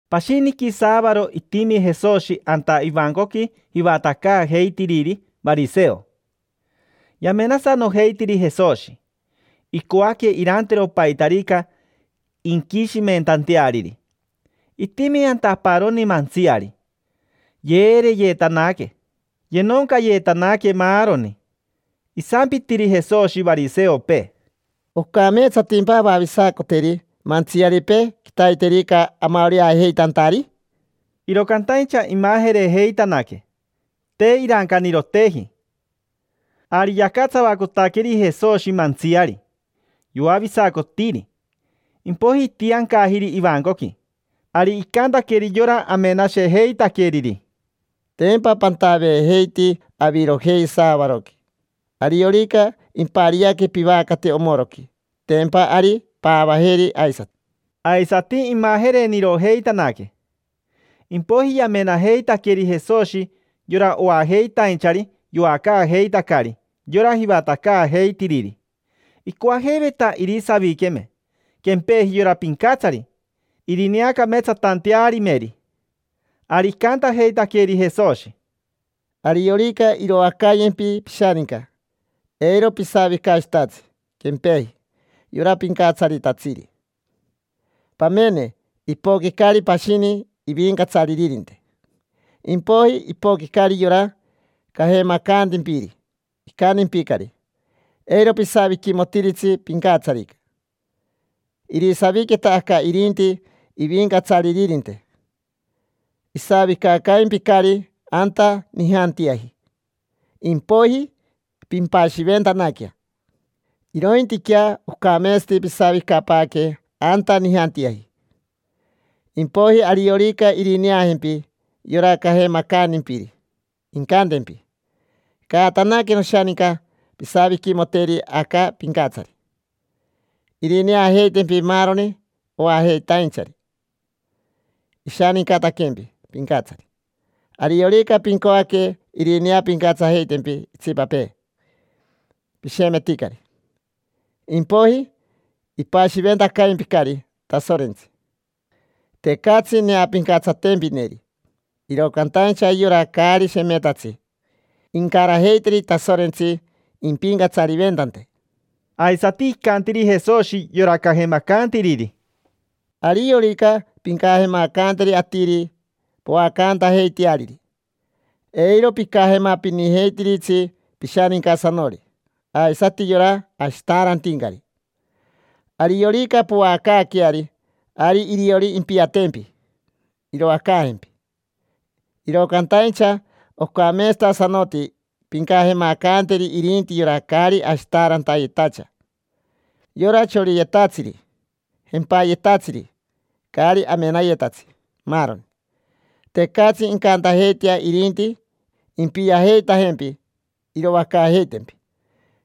Pashiniqui saavaro itimi Jesoshi anta ivancoqui jivatacaajeitiriri variseo. Yamenasanojeitiri Jesoshi, icoaque irantero paitarica inquishimentanteariri. Itimi anta aparoni mantsiari, yeereyetanaque, yenoncayetanaque maaroni. Isampitiri Jesoshi variseopee: —¿Ocameetsatimpa avavisacoteri mantsiaripee quitaiterica amaoreajeitantari? Iro cantaincha imajerejeitanaque, te irancaniroteji. Ari yacatsavacotaqueri Jesoshi mantsiari, yoavisacotiri, impoiji itiancajiri ivancoqui. Ari icantaqueri yora amenashejeitaqueriri: —Tempa pantaveejeiti avirojei saavaroqui. Ariorica impariaque pivacate omoroqui, tempa ari paavajeri aisati. Aisati, imajerenirojeitanaque. Impoiji yamenajeitaqueri Jesoshi yora oajeitainchari yoacaajeitacari yora jivatacaajeitiriri. Icoajeiveta irisaviqueme quempeji yora pincatsari irineacameetsatantearimeri. Ari icantajeitaqueri Jesoshi: —Ariorica iroacayempi pishaninca, eiro pisavicashitatsi quempeji yora pincatsaritatsiri. Pamene, ipoquicari pashini ivincatsaririnte, impoiji ipoquicari yora cajemacantimpiri, icantimpicari: “Eiro pisaviquimotiritsi pincatsarica. Irisaviqueta aca irinti ivincatsaririnte”. Isavicacaimpicari anta nijantiaji, impoiji pimpashiventanaquea. Irointiquea ocameetsati pisavicapaaque anta nijantiaji. Impoiji ariorica irineajempi yora cajemacantimpiri, incantempi: “Caatanaque, noshaninca, pisaviquimoteri aca pincatsari”. Irineajeitempi maaroni oajeitainchari ishanincataquempi pincatsari. Ariorica pincoaque irineapincatsajeitempi itsipapee, pishemeticari; impoiji ipashiventacaimpicari Tasorentsi: tecatsi neapincatsatempineri. Iro cantaincha yora caari shemetatsi incarajeiteri Tasorentsi impicatsariventante. Aisati icantiri Jesoshi yora cajemacantiriri: —Ariorica pincajemacanteri atiri poacantajeiteariri, eiro picajemapinijeitiritsi pishanincasanori aisati yora ashitaarantincari. Ariorica poacaaqueari, ari iriori impiatempi, iroacaajempi. Iro cantaincha ocameetsatasanoti pincajemacanteri irinti yora caari ashitaarantayetacha, yora choriyetatsiri, jempayetatsiri, caari amenayetatsi, maaroni. Tecatsi incantajeitea irinti impiajeitajempi iroacaajeitempi.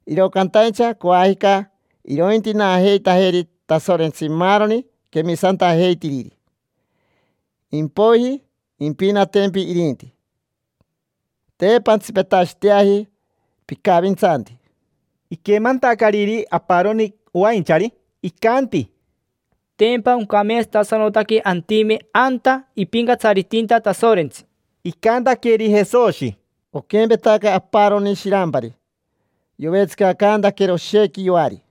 Iro cantaincha coajica irointinaajeitajeri Tasorentsi maaroni quemisantajeitiriri. Impoiji impinatempi irinti. Te pantsipetashiteaji picavintsanti. Iquemantacariri aparoni oainchari, icanti: —Tempa oncameetsatasanotaque antime anta ipincatsaritinta Tasorentsi. Icantaqueri Jesoshi: —Oquempetaca aparoni shirampari. Yovetsicacantaquero oshequi yoari,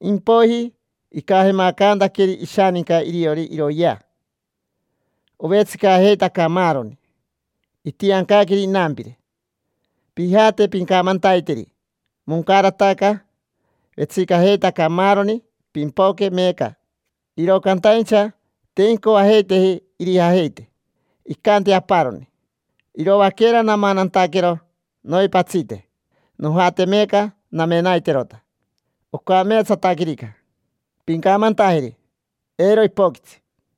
impoiji icajemacantaqueri ishaninca iriori iroyea. Ovetsicajeitaca maaroni. Itiancaqueri inampire: “Pijate, pincamantaiteri: ‘Moncarataca, vetsicajeitaca maaroni, pimpoque meeca’”. Iro cantaincha te incoajeiteji irijajeite. Icanti aparoni: “Iroaquera namanantaquero noipatsite. Nojate meeca namenaiterota, ocameetsataquerica. Pincamantajeri: ‘Eiro ipoquitsi’”.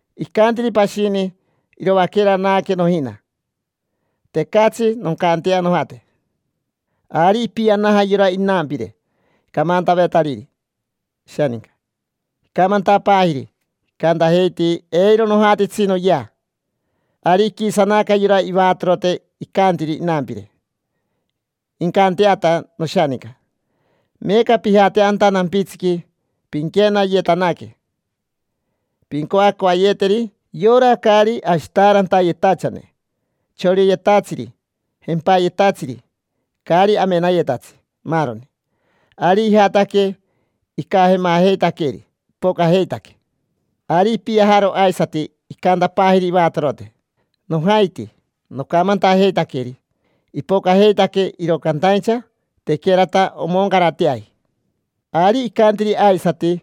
Icantiri pashini: “Iroaquera naaque nojina. Tecatsi noncantea nojate”. Ari ipianaja yora inampire camantavetariri ishaninca. Icamantapaajiri: “Icantajeiti: ‘Eiro nojatitsi noyea’”. Ari iquisanaca yora ivatorote, icantiri inampire: “Incanteata noshaninca. Meeca pijate anta nampitsiqui, pinquenayetanaque pincoacoayeteri yora caari ashitaarantayetachane, choriyetatsiri, jempayetatsiri, caari amenayetatsi, maaroni”. Ari ijataque, icajemajeitaqueri, ipocajeitaque. Ari ipiajaro aisati, icantapaajiri ivatorote: “Nojaiti, nocamantajeitaqueri. Ipocajeitaque, iro cantaincha tequerata omoncarateaji”. Ari icantiri aisati: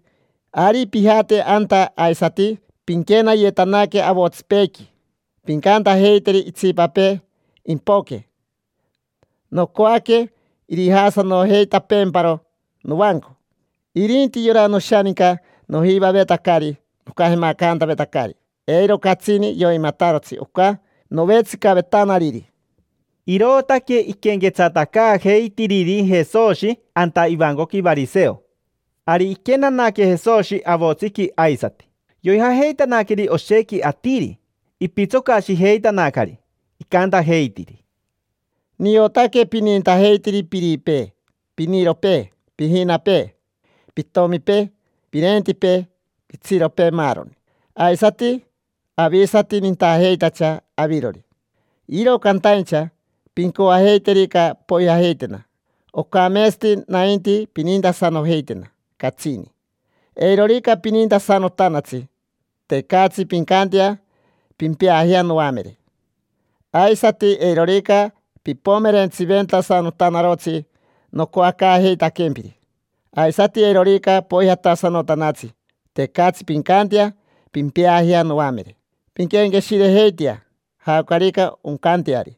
“Ari pijate anta aisati, pinquenayetanaque avotsipeequi, pincantajeiteri itsipapee impoque, nocoaque irijaasanojeitapeemparo novanco. Irinti yora noshaninca nojivavetacari nocajemacantavetacari, eiro catsini yoimatarotsi oca novetsicavetanariri”. Irootaque iquenquetsatacaajeitiriri Jesoshi anta ivancoqui variseo. Ari iquenanaque Jesoshi avotsiqui aisati, yoijajeitanaqueri oshequi atiri. Ipitsocashijeitanacari, icantajeitiri: —Niotaque pinintajeitiri piripee, piniropee, pijinapee, pitomipee, pirentipee, pitsiropee, maaroni. Aisati avisati nintajeitacha avirori. Iro cantaincha pincoajeiterica poijajeitena, ocametsati nainti pinintasanojeitena catsini. Eirorica pinintasanotanatsi, tecatsi pincantea pimpeajea noamere. Aisati eirorica pipomerentsiventasanotanarotsi nocoacaajeitaquempiri, aisati eirorica poijatasanotanatsi, tecatsi pincantea pimpeajea noamere. Pinquenqueshirejeitea jaocarica oncanteari.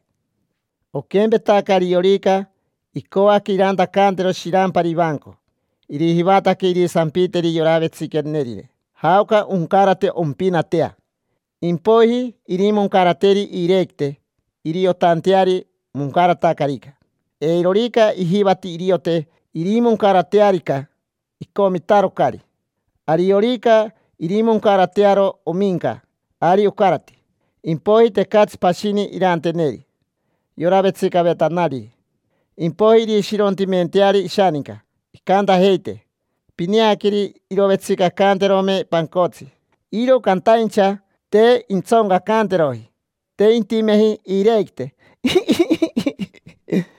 Oquempetaca ariorica icoaque irantacantero shirampari ivanco, irijivataque irisampiteri yora vetsiquenerine jaoca oncarate ompinatea. Impoiji irimoncarateri iirequite iriotanteari moncaratacarica. Eirorica ijivati iriote irimoncaratearica, icomitarocari. Ariorica irimoncaratearo ominca, ari ocarati. Impoiji tecatsi pashini iranteneri yora vetsicavetanariri. Impoiji irishirontimenteari ishaninca. Incantajeite: “Pineaqueri, irovetsicacanterome pancotsi, iro cantaincha te intsoncacanteroji. Te intimeji iirequite, iji, iji, iji”.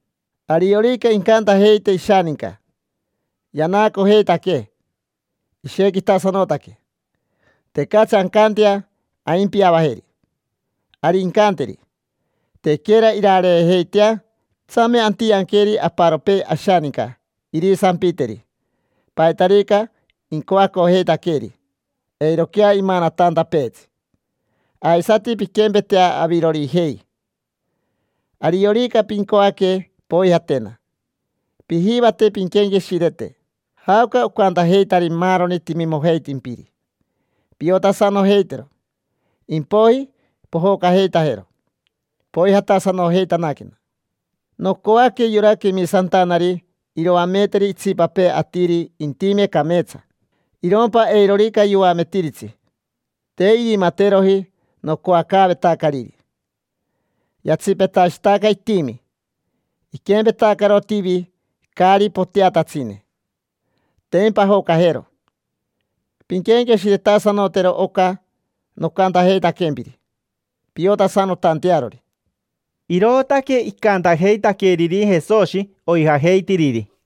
Ariorica incantajeite ishaninca: “Yanaacojeitaquee, ishequitasanotaque. Tecatsi ancantea aimpiavajeri”. Ari incanteri: “Tequera irareejeitea, tsame antianqueri aparopee ashaninca irisampiteri paitarica incoacojeitaqueeri eiroquea imanatantapeetsi”. Aisati pinquempetea avirorijei: ariorica pincoaque poijatena, pijivate pinquenqueshirete jaoca ocantajeitari maaroni timimojeitimpiri. Piotasanojeitero: impoiji pojocajeitajero, poijatasanojeitanaquena. Nocoaque yora quemisantanari iroameteri itsipapee atiri intime cameetsa, irompa eirorica yoametiritsi, te irimateroji nocoacaavetacariri, yatsipetashitaca itimi. Iquempetacaro tivi caari poteatatsine: tempa ajocajero. Pinquenqueshiretasanotero oca nocantajeitaquempiri piotasanotantearori. Irootaque icantajeitaqueriri Jesoshi oijajeitiriri.